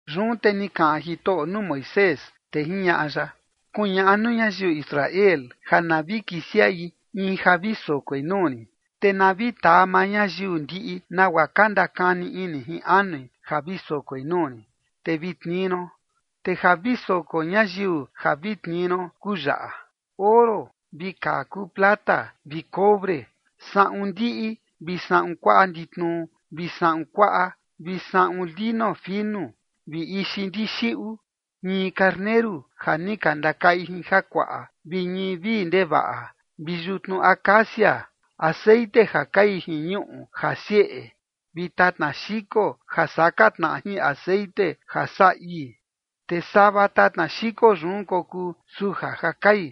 Yun te ni kaꞌan Jitoꞌo nuu Moisés, te jiñaꞌa ya: ―Kuñaꞌa nuu ñayiu Israel ja na vi kisiaꞌi in ja vi sokoi nuu rin, te na vi taa maa ñayiu ndiꞌi nagua ka ndakani ini jin anui ja vi sokoi nuu rin, te vi tnii ron. Te ja vi soko ñayiu ja vi tnii ron kuu yaꞌa: oro, vi kaa kuu plata, vi cobre, saꞌun ndiꞌi, vi saꞌun kuaꞌa nditnu, vi saꞌun kuaꞌa, vi saꞌun lino finu, vi ixi ndixiꞌu, ñii karneru ja ni ka ndakaꞌi jin jakuaꞌa, vi ñii vii ndevaꞌa, vi yutnu acacia, texeꞌen ja kai jin ñuꞌu ja sieꞌe, vi tatna xiko ja saka tnaꞌa jin texeꞌen ja saꞌa ii, te sava tatna xiko yun kokuu suja ja kai.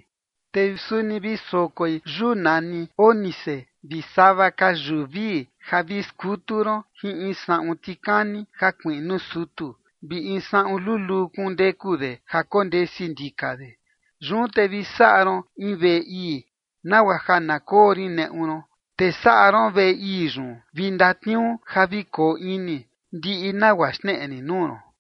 Te suni vi sokoi yuu nani ónice, vi sava ka yuu vii ja vi skutu ron jin in saꞌun tikani ja kuiꞌnu sutu, vi in saꞌun luluu kundeku de ja kondesi ndika de. Yun te vi saꞌa ron in veꞌe ii, nagua ja na koo rin neꞌu ron. Te saꞌa ron veꞌe ii yun vi ndatniuu ja vi koo ini, ndiꞌi nagua xneꞌe rin nuu ron.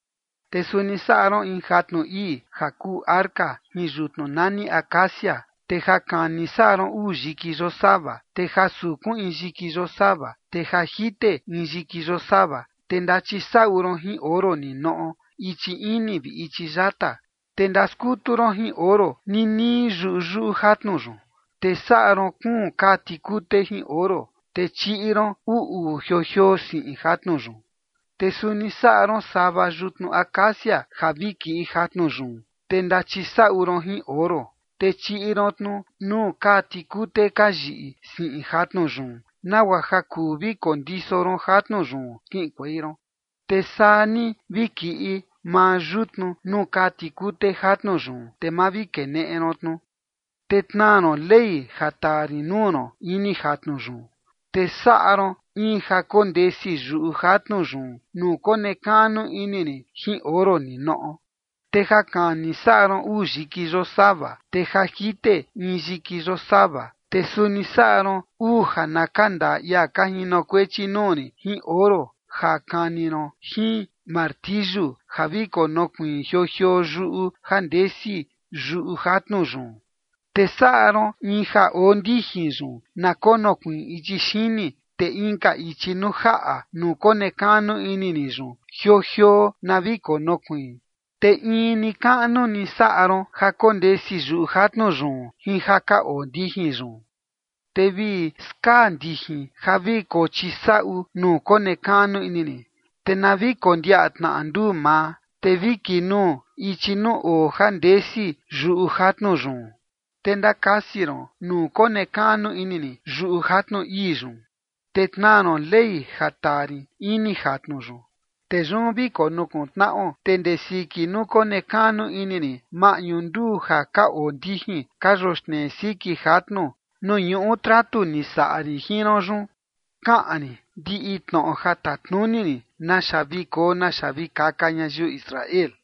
’Te suni saꞌa ron in jatnu ii ja kuu arca jin yutnu nani acacia, te ja kani saꞌa ron uu yiki yosava, te ja sukun in yiki yosava, te ja jite in yiki yosava. Te ndachisaꞌu ron jin oro ninoꞌo ichi ini vi ichi yata, te ndaskutu ron jin oro ninii yuyuꞌu jatnu yun. Te saꞌa ron kuun kaa tikute jin oro, te chiꞌi ron uu uu jioo jioo siꞌin jatnu yun. Te suni saꞌa ron sava yutnu acacia ja vi kiꞌi jatnu yun, te ndachisaꞌu ron jin oro. Te chiꞌi ron tnu nuu kaa tikute ka yiꞌi siꞌin jatnu yun, nagua ja kuu vi kondiso ron jatnu yun kiꞌinkuei ron. Te saa ni vi kiꞌi maa yutnu nuu kaa tikute jatnu yun, te ma vi keneꞌe ron tnu. Te tnaa ron Ley ja taa rin nuu ron ini jatnu yun. ’Te saꞌa ron in ja kondesi yuꞌu jatnu yun nuu konekaꞌnu ini rin jin oro ninoꞌo. Te ja kani saꞌa ron uu yiki yosava, te ja jite in yiki yosava. Te suni saꞌa ron uu ja na ka ndaa ia ka jinokuechi nuu rin jin oro ja kani ron jin martiyu ja vi konokuiin jioo jioo yuꞌu ja ndesi yuꞌu jatnu yun. Te saꞌa ron in ja oo ndijin yun na konokuiin ichi xini, te inka ichi nuu jaꞌa nuu konekaꞌnu ini rin yun jioo jioo na vi konokuiin. Te in ni kaꞌnu ni saꞌa ron ja kondesi yuꞌu jatnu yun jin ja ka oo ndijin yun. Te vi skaa ndijin ja vi kochisaꞌu nuu konekaꞌnu ini rin, te na vi kondiaꞌa tnaꞌa nduu maa, te vi kinuu ichi nuu oo ja ndesi yuꞌu jatnu yun. Te ndakasi ron nuu konekaꞌnu ini rin yuꞌu jatnu ii yun, te tnaa ron Ley ja taa rin ini jatnu yun. Te yun vi konukuntnaꞌo, te ndee siki nuu konekaꞌnu ini rin maꞌñu nduu ja ka oo ndijin ka yoxnee siki jatnu nuu ñuꞌu tratu ni saꞌa rin jin ron yun, kaꞌan rin ndiꞌi tnoꞌo ja tatnuni rin naxa vi koo naxa vi kaka ñayiu Israel.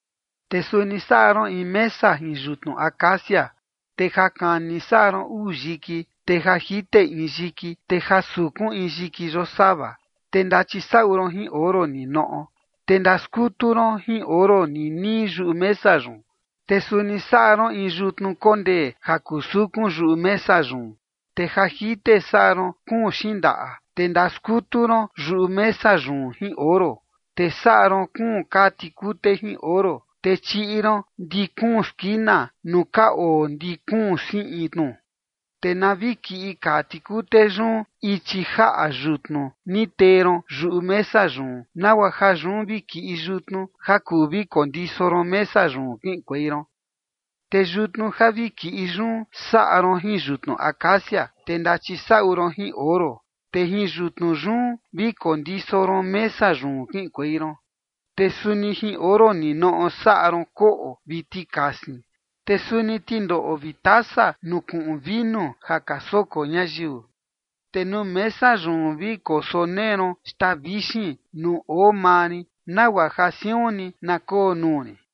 ’Te suni saꞌa ron in mesa jin yutnu acacia. Te ja kani saꞌa ron uu yiki, te ja jite in yiki, te ja sukun in yiki yosava. Te ndachisaꞌu ron jin oro ninoꞌo. Te ndaskutu ron jin oro ninii yuꞌu mesa yun. Te suni saꞌa ron in yutnu kondee ja kuu sukun yuꞌu mesa yun. Te ja jite saꞌa ron kuun xindaꞌa, te ndaskutu ron yuꞌu mesa yun jin oro. Te saꞌa ron kuun kaa tikute jin oro, te chiꞌi ron ndi kuun skina nuu ka oo ndi kuun siꞌin tnu. Te na vi kiꞌin kaa tikute yun ichi jaꞌa yutnu ni tee ron yuꞌu mesa yun, nagua ja yun vi kiꞌi yutnu ja kuu vi kondiso ron mesa yun kiꞌinkuei ron. Te yutnu ja vi kiꞌi yun saꞌa ron jin yutnu acacia. Te ndachisaꞌu ron jin oro, te jin yutnu yun vi kondiso ron mesa yun kiꞌinkuei ron. Te suni jin oro ninoꞌo saꞌa ron koꞌo vi tikasin, te suni tindoꞌo vi tasa nuu kuꞌun vinu ja ka soko ñayiu. Te nuu mesa yun vi kosonee ron xtaa vixin nuu oo maa rin, nagua ja siun ni na koo nuu rin.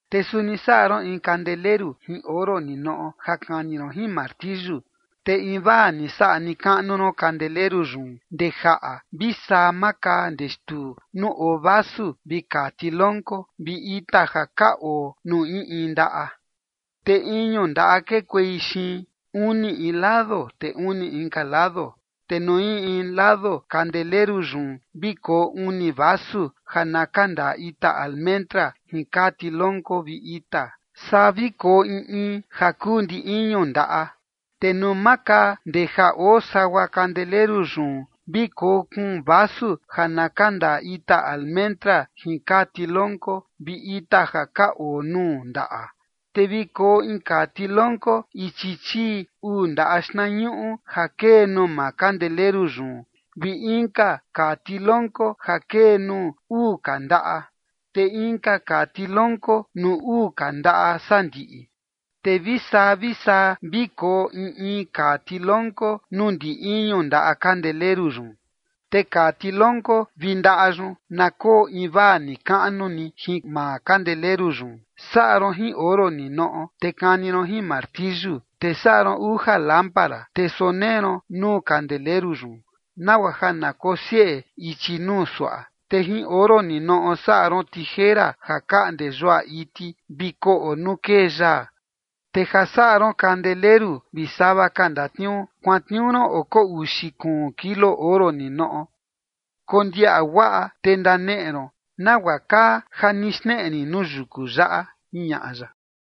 ’Te suni saꞌa ron in kandeleru jin oro ninoꞌo ja kani ron jin martiyu. Te invaa ni saꞌa ni kaꞌnu ron kandeleru yun ndee jaꞌa vi saa maa kaa ndee xtuu nuu oo vasu vi kaa tilonko vi ita ja ka oo nuu in in ndaꞌa. Te iñu ndaꞌa kekuei xiin, uni in lado, te uni inka lado. Te nuu in in lado kandeleru yun, vi koo uni vasu ja na kandaa ita almendra jin kaa tilonko vi ita. Saa vi koo in in ja kuu ndi iñu ndaꞌa. Te nuu maa kaa ndee ja oo sagua kandeleru yun vi koo kuun vasu ja na kandaa ita almendra jin kaa tilonko vi ita ja ka oo nuu ndaꞌa. Te vi koo in kaa tilonko ichi chii uu ndaꞌa xtnañuꞌu ja kee nuu maa kandeleru yun, vi inka kaa tilonko ja kee nuu uu ka ndaꞌa, te inka kaa tilonko nuu uu ka ndaꞌa sandiꞌi. Te vi saa vi saa vi koo in in kaa tilonko nuu ndi iñu ndaꞌa kandeleru yun. Te kaa tilonko vi ndaꞌa yun na koo invaa ni kaꞌnu ni jin maa kandeleru yun. Saꞌa ron jin oro ninoꞌo, te kani ron jin martiyu. Te saꞌa ron uja lámpara, te sonee ron nuu kandeleru yun, nagua ja na kosieꞌe ichi nuu suaꞌa. Te jin oro ninoꞌo saꞌa ron tijera ja kaꞌnde yuaꞌa iti vi koꞌo nuu kee yaa. Te ja saꞌa ron kandeleru vi sava ka ndatniuu, kuantniuu ron oko uxi kuun kilo oro ninoꞌo. Kondiaꞌa guaꞌa, te ndaneꞌe ron nagua kaa ja ni xneꞌe rin nuu yuku yaꞌa ―jiñaꞌa ya.